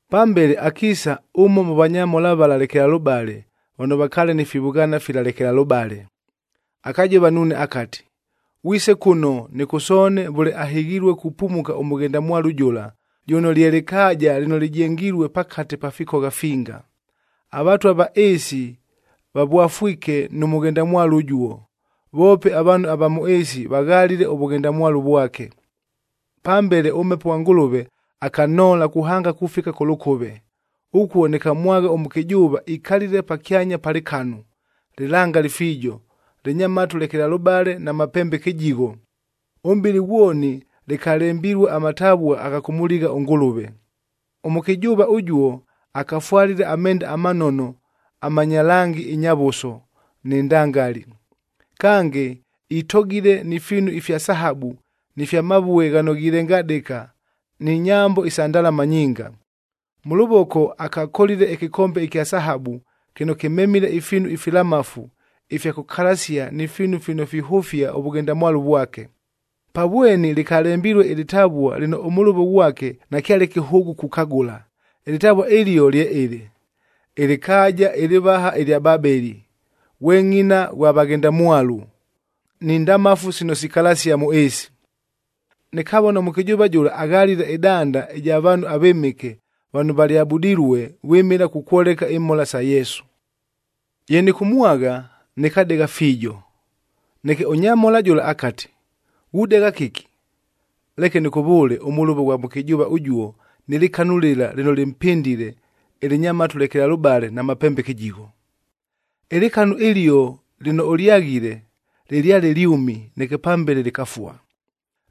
Pambele akiisa ʉmo mʉ vanyamhola vala lekelalʉbale vano vakaale ni fivʉghaana fila lekelalʉbale, akajova nuune akati, “Ghwise kʉno nɨkʉsoone vʉle ahɨghilue kupumuka ʉmʉghendamwalu jʉla, jʉno lye lɨkaaja lɨno lɨjengilue pakate pa fikogha finga. Avatwa va ɨɨsi vavwafwike nʉ mʉghendamwalu ʉjuo, voope avaanhu ava mʉ ɨɨsi vaghalile ʉvʉghendamwalu vwake.” Pambele ʉMhepo ghwa Ngʉlʉve akanhoola kuhanga kufika kʉ lʉkʉve. Ʉkuo nɨkamwagha ʉmʉkɨjʉʉva ikalile pakyanya pa lɨkanu, lɨlangali fiijo, lɨnya matu lekelalʉbale na mapembe kɨjigho. Ʉmʼbɨlɨ ghwoni lɨkalembilue amatavua agha kʉmʉligha ʉNgʉlʉve. Ʉmʉkɨjʉʉva ʉjuo akafwalile amenda amanono amanya langi ɨnyavʉso nɨ ndangali. Kange, itogile ni fiinu ifya sahabu ni fya mavue ghano ghilengadɨka ni nyambo isa ndalama nyinga. Mʉ lʉvoko akakolile ɨkɨkombe ɨkya sahabu kɨno kɨmemile ifiinu ifilamafu ifya kʉkalasia ni fiinu fino fihʉfia ʉvʉghendamwalu vwake. Pa vweni lɨkalembilue ɨlɨtavua lɨno ʉmʉlʉvo ghwake nakyale kɨhʉʉgʉ kukagʉla. Ɨlɨtavua ɨlio lye ɨlɨ, Ɨlɨkaaja ɨlɨvaha ɨlya Babeli, ghwe ngʼina ghwa Vaghendamwalu ni ndamafu sino sikalasia mʉ ɨɨsi. Nɨkavona ʉmʉkɨjʉʉva jʉla aghalile ɨdanda ɨja vaanhu avɨmɨke vano valyabudilue vwɨmɨla kukwoleka imhola sa Yesu. Ye nɨkʉmwagha, nɨkadegha fiijo. Neke ʉnyamhola jʉla akati, “Ghudegha kɨki? Leke nɨkʉvʉʉle ʉmʉlʉvo ʉghwa mʉkɨjʉʉva ʉjuo nɨ lɨkanu lɨla lɨno lɨmpɨndile, ɨlɨnya matu lekelalʉbale na mapembe kɨjigho. Ɨlɨkanu ɨlio lɨno ʉlyaghile, lɨlyale lyʉmi neke pambele lɨkafua.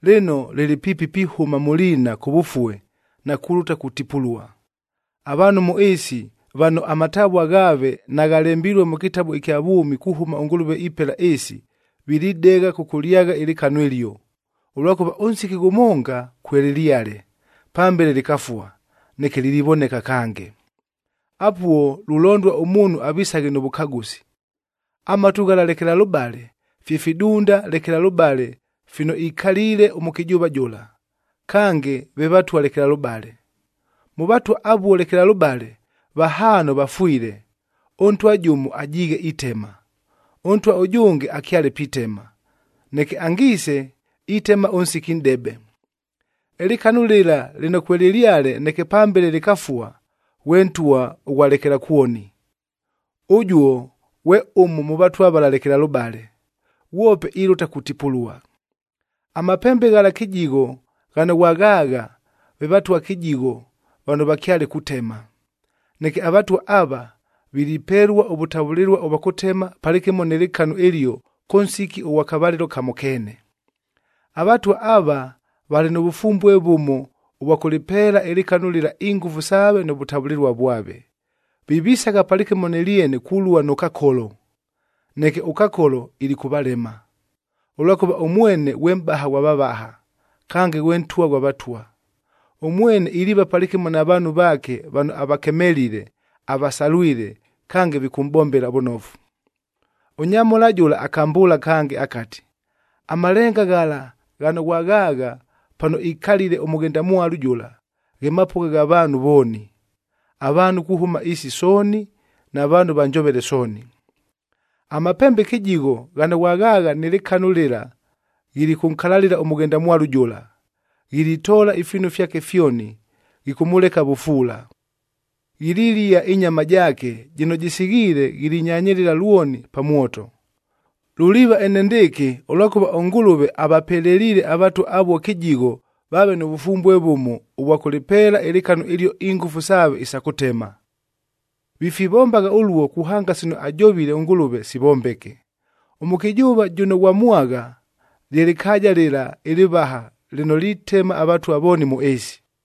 Lɨno, lɨlɨ piipi pihʉma mʉ liina kʉvʉfue na kulʉta kutipulua. Avaanhu mʉ ɨɨsi vano amatavua ghaave naghalembilue mʉ kɨtabu ɨkya vwʉmi kuhʉma ʉNgʉlʉve ipela ɨɨsi, vilidegha kʉkʉlyagha ɨlɨkanu ɨlio, ʉlwakʉva ʉnsiki ghʉmonga kwelɨlyale, pambele lɨkafua, neke lilivoneka kange. “Apuo lulondua ʉmuunhu avisaghe nʉ vʉkagʉsi. Amatu ghala lekelalʉbale, fye fidunda lekelalʉbale fino ikaliile ʉmʉkɨjʉʉva jʉla, kange ve vatwa lekelalʉbale. Mʉ vatwa avuo lekelalʉbale, vahaano vafwile, ʉntwa jʉmo ajiighe itema, ʉntwa ʉjʉnge akyale pitema, neke angiise, itema ʉnsiki nʼdebe. Ɨlɨkanu lɨla lɨno kwelɨlyale neke pambele lɨkafua, ghwe ntwa ʉghwa lekelakwoni. Ʉjuo ghwe ʉmo mʉ vatwa vala lekelalʉbale. Ghwope ilʉta kutipulua. “Amapembe ghala kɨjigho ghano ghwaghaagha, ve vatwa kɨjigho vano vakyale kutema. Neke avatwa ava, vilipelua ʉvʉtavʉlɨlua ʉvwa kʉtema palɨkɨmo nɨ lɨkanu ɨlio kʉ nsiki ʉghwa kavalɨlo kamo keene. Avatwa ava, valɨ nʉ vʉfumbue vʉmo ʉvwa kʉlɨpeela ɨlɨkanu lɨla ingʉfu saave nʉ vʉtavʉlɨlua vwave. Vivisagha palɨkɨmo nɨ lyene kulua nʉ Kakolo. Neke ʉKakolo ilikʉvalema, ʉlwakʉva ʉmwene ghwe Mʼbaha ghwa vavaha, kange ghwe Ntwa ghwa vatwa. Ʉmwene iliiva palɨkɨmo na vaanhu vaake vano avakemelile, avasalwile, kange vikʉmʼbombela vʉnofu.” Ʉnyamhola jʉla akambʉʉla kange akati, “Amalenga ghala ghano ghwaghaagha pano ikalile ʉmʉghendamwalu jʉla, ghe mapʉgha gha vaanhu vooni: avaanhu kuhʉma ɨɨsi sooni, na vaanhu va njovele sooni. “Amapembe kɨjigho ghano ghwaghaagha nɨ lɨkanu lɨla, ghilikʉnkalalɨla ʉmʉghendamwalu jʉla. Ghilitoola ifiinu fyake fyoni, ghikʉmʉleka vʉfuula. Ghililia ɨnyama jaake, jɨno jɨsighiile ghilinyanyɨlɨla lwoni pa mwoto. Luliiva enendɨɨkɨ, ʉlwakʉva ʉNgʉlʉve avapeleliile avatwa avuo kɨjigho vaave nʉ vʉfumbue vʉmo ʉvwa kʉlɨpeela ɨlɨkanu ɨlio ingʉfu saave isa kʉtema. Vifivombagha ʉluo kuhanga sino ajovile ʉNgʉlʉve, sivombeke. Ʉmʉkɨjʉʉva jʉno ghwamwagha, lye lɨkaaja lɨla ɨlɨvaha lɨno litema avatwa vooni mʉ ɨɨsi.”